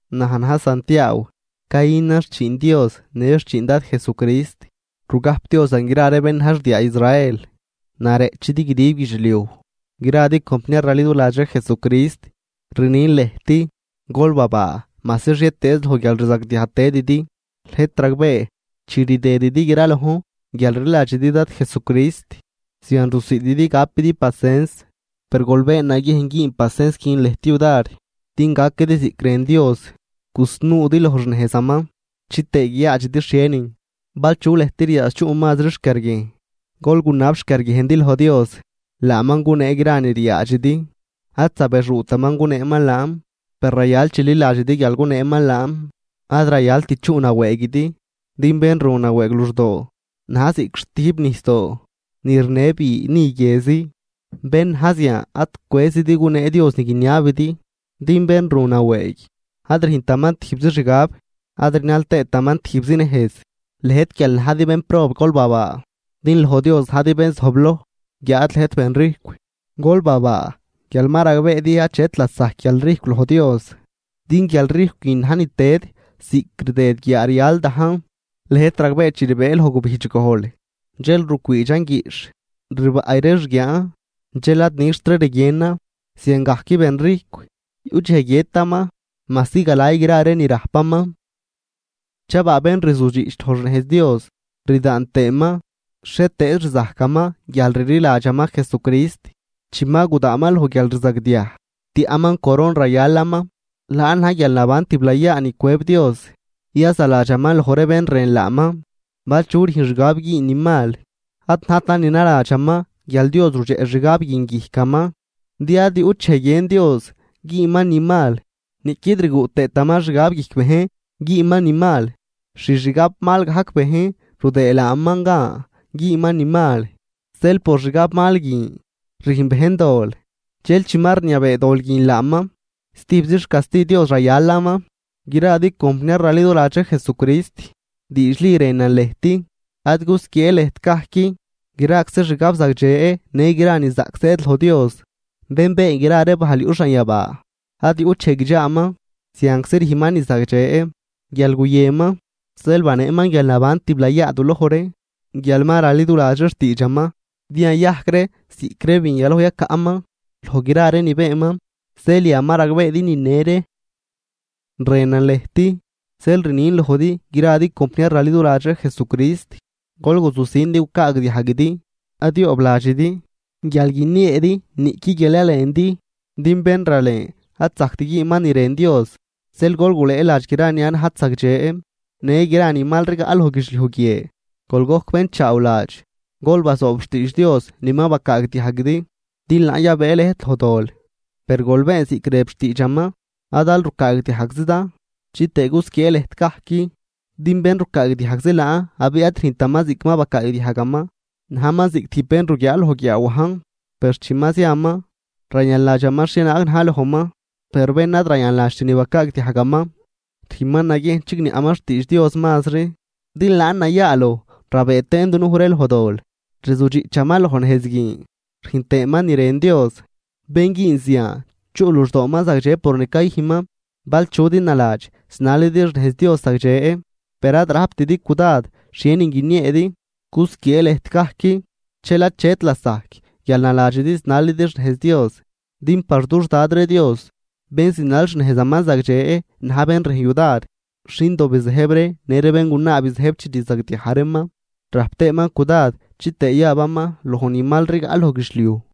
Naj na̱j Santiaaw, cayünan xchiin Dios në xchiin Dad Jesucrist, rugajpdiozan gra ree bén na̱j xdiaa Israel, nareꞌchidi guidib guidxliuj. Gradi compniar raliduladx ree Jesucrist, rnin lëjt, gol babaa majsi xhietëez loj guialrzagdiaj tëdidi. Lëjt ragbee, chi rdëdidi gralojn guial rliladxidi Dad Jesucrist, zian rusiididi gapidi pasens. Per gol been naguiejn güün pasens guin lëjt yudar din gaquidi ziꞌc rën Dios, gusnuudi loj xnejzaman, chitëë guiyaadxidi xhienin. Bal chu lëjt riaadx chuꞌ mazri xquiarguiejn, gol gunab xquiarguiejndi loj Dios. Laaman gunee gra ni riaadxidi, ad zabexuutaman guneeman laan. Per rayal chililadxidi guial guneeman laan, ad rayalt chuꞌ nawëëguidi, din bén ru nawëëg luxdoo na̱j ziꞌc xtüjp nijsdoo ni rinë bi ni guiezi. Bén na̱j zian ad cwëzidi gunee Dios ni guiniabidi, din bén ru nawëëg, ad rüjntaman tijbzi xgab, ad rinal tëëtaman tijbzi nejz. Lëjt guial najdi bénprob gol babaa, din loj Dios najdi bén zojbloj. Guiáad lëjt benrijcw, gol babaa guial ma ragbeedi achet lasajc guialrijcw loj Dios, din guialrijcw guin najn ni tëd ziꞌc rdëd guiaa rial dajn. Lëjt ragbee chi rbëë loj gubijdx gojl, dxel rucwiidxan guiꞌxh, rbaꞌy ree xguiaan, dxel ad nixtri rguienan. Ziangajc benrijcw yuꞌ dxej guiëtaman majsi galay gra ree ni rajpaman. Chabaa bén rzudxiꞌch loj xnejz Dios rdaan tëëman xhietëëz rzajcaman guial rliladxaman Jesucrist. Chi ma gudaanman loj guialrzagdiaj, tiaꞌman coron rayalaman, laan na̱j guialnaban tiblayaa ni cwëb Dios yazaladxaman loj ree bén rën laaman. Bal chu rüjn xgab güün ni mal, ad najtan ni naladxaman guial Dios rudxeꞌ xgab guin guijcaman. Din ad yuꞌt dxej guiën Dios güünman ni mal, niꞌquid rguꞌ tëëtaman xgab guijc bejn güünman ni mal. Xixgabmal gajc bejn rudëë laaman gan güünman ni mal. Zeel por xgabmal guin rüjn bejn dol, dxel chi ma rniabee dol guin laaman, stijbzi xcasti Dios rayalaman. Gradi compniar raliduladx ree Jesucrist, diidxli rënan lëjt, ad gusquiee lëjt gajc. Graczi xgab zagdxe në gra ni zaꞌc zëëd loj Dios, bén been gra ree bajl yuꞌ xanyabaa. Ad yuꞌt dxej guidxaaman, zianczi rüjnman ni zagdxe. Guial guyënman, zeel baneeman guialnaban tiblayaa duloj ree, guial ma raliduladx ree xtiidxaman, din yayajc ree ziꞌc ree bin yaloj yacaꞌman loj gra ree ni beenman. Zeel yan ma ragbeedi nine ree. Rënan lëjt, zeel rnin lojdi gradi compniar raliduladx ree Jesucrist: Gol guzujsin din gucaagdiajguidi, ad yoobladxidi guial guinieedi niꞌqui guial yalendi, din bén ralen ad zajct güünman ni rën Dios. Zeel gol gulëëladx gra ni ad najt zagdxe në gra ni mal rigaꞌ loj guidxliuj guie, gol gojc bénchaawladx, gol bazoob xtiidx Dios ni ma bacaagdiajguidi, din laan yabëë lëjt loj dol. Per gol been ziꞌc rëb xtiidxaman, ad aal rucaagdiajgzidan, chitëë gusquiee lëjt gajc. Din bén rucaagdiajgzi laan abiꞌ ad rüjntaman ziꞌc ma bacaagdiajgaman, najman ziꞌc tijb bén ruguiaa loj guiaawajn, per chi ma ziaman, rayanladxaman xhienaag na̱j lojman. Per bén ad rayanladxt ni bacaagdiajgaman rüjnman naguiejn chigniaꞌman xtiidx Dios mazri, din laan nayaaloj rabëë tëën dunuj ree loj dol. Rzudxiꞌchaman loj nejz guin, rüjn tëëman ni rën Dios. Bén güün zian chuꞌ luxdooman zagdxe por ni cayüjnman. Bal chudi naladx zinalidi xnejz Dios zagdxe per ad rajptidi cudad xhienin guinieedi, cusquiee lëjt gajc, dxel achet lasajc guial naladxidi zinalidi xnejz Dios. Din par dux Dad ree Dios bén zinal xnejzaman zagdxe na̱j bén rüjn yudar xindo bizëjb ree në ree béngunaa bizëjb chi rzagdiaj reeman, rajp tëëman cudad chitëë yabaman loj ni mal rigaꞌ loj guidxliuj.